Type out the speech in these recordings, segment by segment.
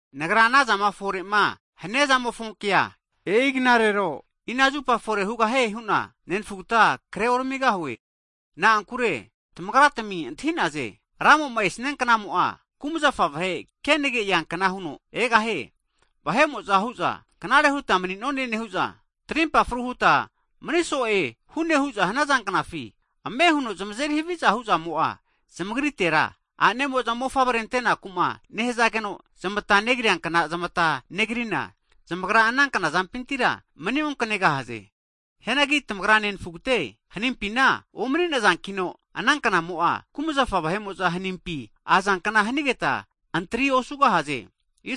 Nagra anazama efore'ma hania zamofonkea, e'i knarero, e'ina zupa fore hugahie hu'na nenafugta kreoramigahue. Na'ankure tamagratmi antahi'naze, Ramo'ma esianknamo'a, kumazafa vahe kenage eankna huno egahie. Vahe'mo'za hu'za knare huta mani'none nehu'za, tarimpa fru huta maniso'e hune hu'za hanaza knafi ame huno zamazeri haviza hu'zamo'a zamagritera, a'nemo'za mofavre antenaku'ma nehazageno zamata negriankna zamata negrina, zamagra ana knazampintira mani onkanegahaze. Hianagi tamagra nenafugate, hanimpina omani'nazankino, ana knamo'a kumazafa vahe'mo'za hanimpi azanknara hanigeta antri osugahaze.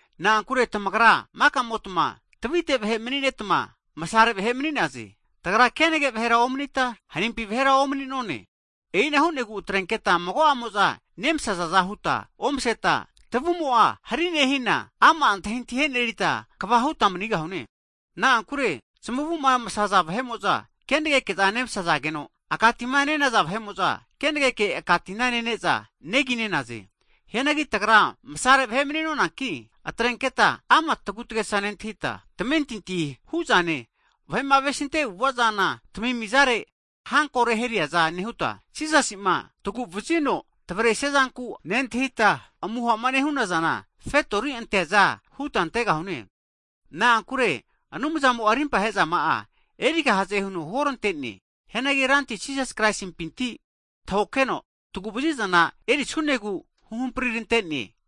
Na'ankure tamagra maka'motma tavite vahe mani'netma, masare vahe mani'naze. Tagra kenage vahera omanita, hanimpi vahera omani'none. E'ina hu'negu atrenketa mago'amo'za nemasazaza huta omaseta, tavumo'a hari nehina, ama' antahintahi e'nerita kva huta manigahune. Na'ankure zmavuma masaza vahe'mo'za kenegeke nemasageno, aka tima nenaza vahe'mo'za, kenageke aka tina nene'za neginenaze. Hianagi tagra masare vahe mani'nonanki, atrenketa ama' tagutagesa nentahita, tamentintima huzane, vahe'ma avesinte avu'ava zana tamimizare hanko reheriaza nehuta, Jisasi'ma taguvazino tavresiazanku nentahita amuhama nehunazana, fetori anteaza huta antegahune. Na'ankure Anumzamo'a rimpahe'zama'a erigahaze huno huorantene. Hianagi Ranti Jisas Kraisimpinti tahokeno taguvazizana erisunegu huhamprirante'ne.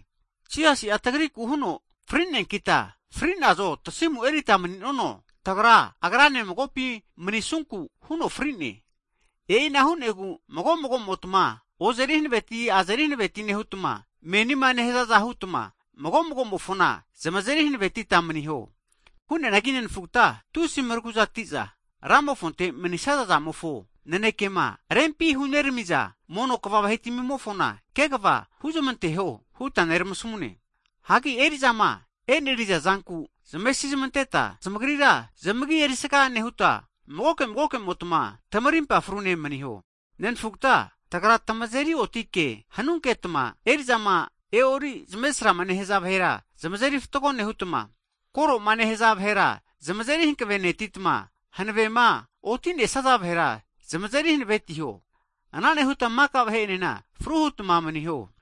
Jisasi'a tagriku huno fri'neankita, fri'nazo tasimu erita mani'nono, tagra Agrane magopi manisunku huno fri'ne. E'ina hu'negu mago magomotma, ozeri hanaveti azeri hanaveti nehutma, menima nehazaza hutma mago magomofona zamazeri hanavetita maniho. Hianagi nenfugata, tusi maraguzatiza Ramofonte manisaza'zamofo nanekema rempima hunerami'za mono kva vahetamimofona, antahizamita zamagesga huzmanteho huta neramasamune. Hagi eri'zama e'neriza zanku zamesizmanteta, zamagrira zamagi erisaga nehuta, magoke magokemotma tamarimpa frune maniho. Hagi nerafugate, tagra tamazeri otike hanunketma eri'zama e'ori zmesrama nehaza vahera zamazeri fatgo nehutma, koroma nehaza vahera zamazeri hankavenetitma, hanavema oti'nesaza vahera zamazeri hanavetiho. Ana nehutma maka vahe enena fru hutma maniho.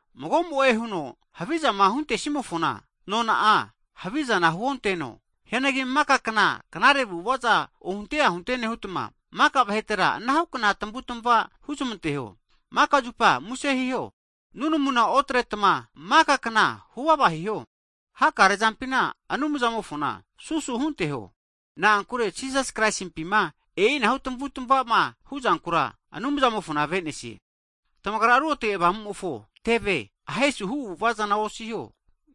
Mago'mo'e huno havizama huntesimofona, nona'a havizana huonteno. Hianagi maka kna knare avu'avaza ohunte ahunte nehutma, maka vahetera anahukna tamavutmava huzmanteho. Makazupa muse hiho. Hagi nunamuna otretma makakna huvava hiho. Hakare'zampina Anumzamofona susu hunteho, na'ankure Jisasi Krasimpima e'inahu tamavutamavama huzankura Anumzamofona avenesie. Tamagra Ruotge Avamumofo teve ahesu hu avu'ava zana osiho.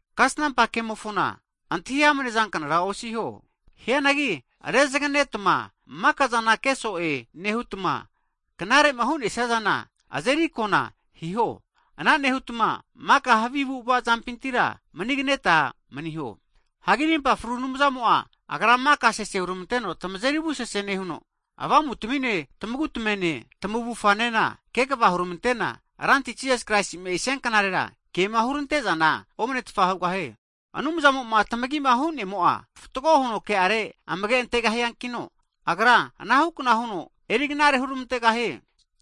Kasnampa kemofona antahi amnezanknara osiho. Hianagi rezaganetma makazana ke so'e nehutma, knarema hunesiazana azeri akona hiho. Ana nehutma, maka havi avu'ava zampintira maniganeta maniho. Hagi rimpa fru Anumzamo'a, Agra maka sese huramanteno tamazeri ruotage nehuno, avamutamine, tamagu tamene, tamavufanena kegava huramantena, Ranti Jisas Kraisi'ma esianknarera kema hurantezana omanetfa hugahie. Anumzamo'ma tamagima hunemo'a, fatgo huno ke'are amage antegahiankino, Agra anahukna huno eriknare huramantegahie.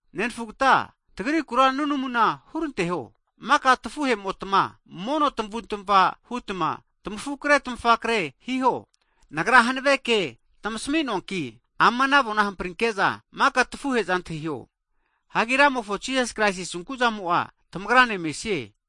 Nenafugate tagrikura nunamuna huranteho. Maka tafu'hemotma mono tamavutamava hutma tamafukre tamafakre hiho. Nagra hanave ke tamasamuanki, ama avona hamprinke'za, maka tafuhe'za antahiho. Hagi Rantimofo Jisas Kraisi asunku'zamo'a tamagrane mesie.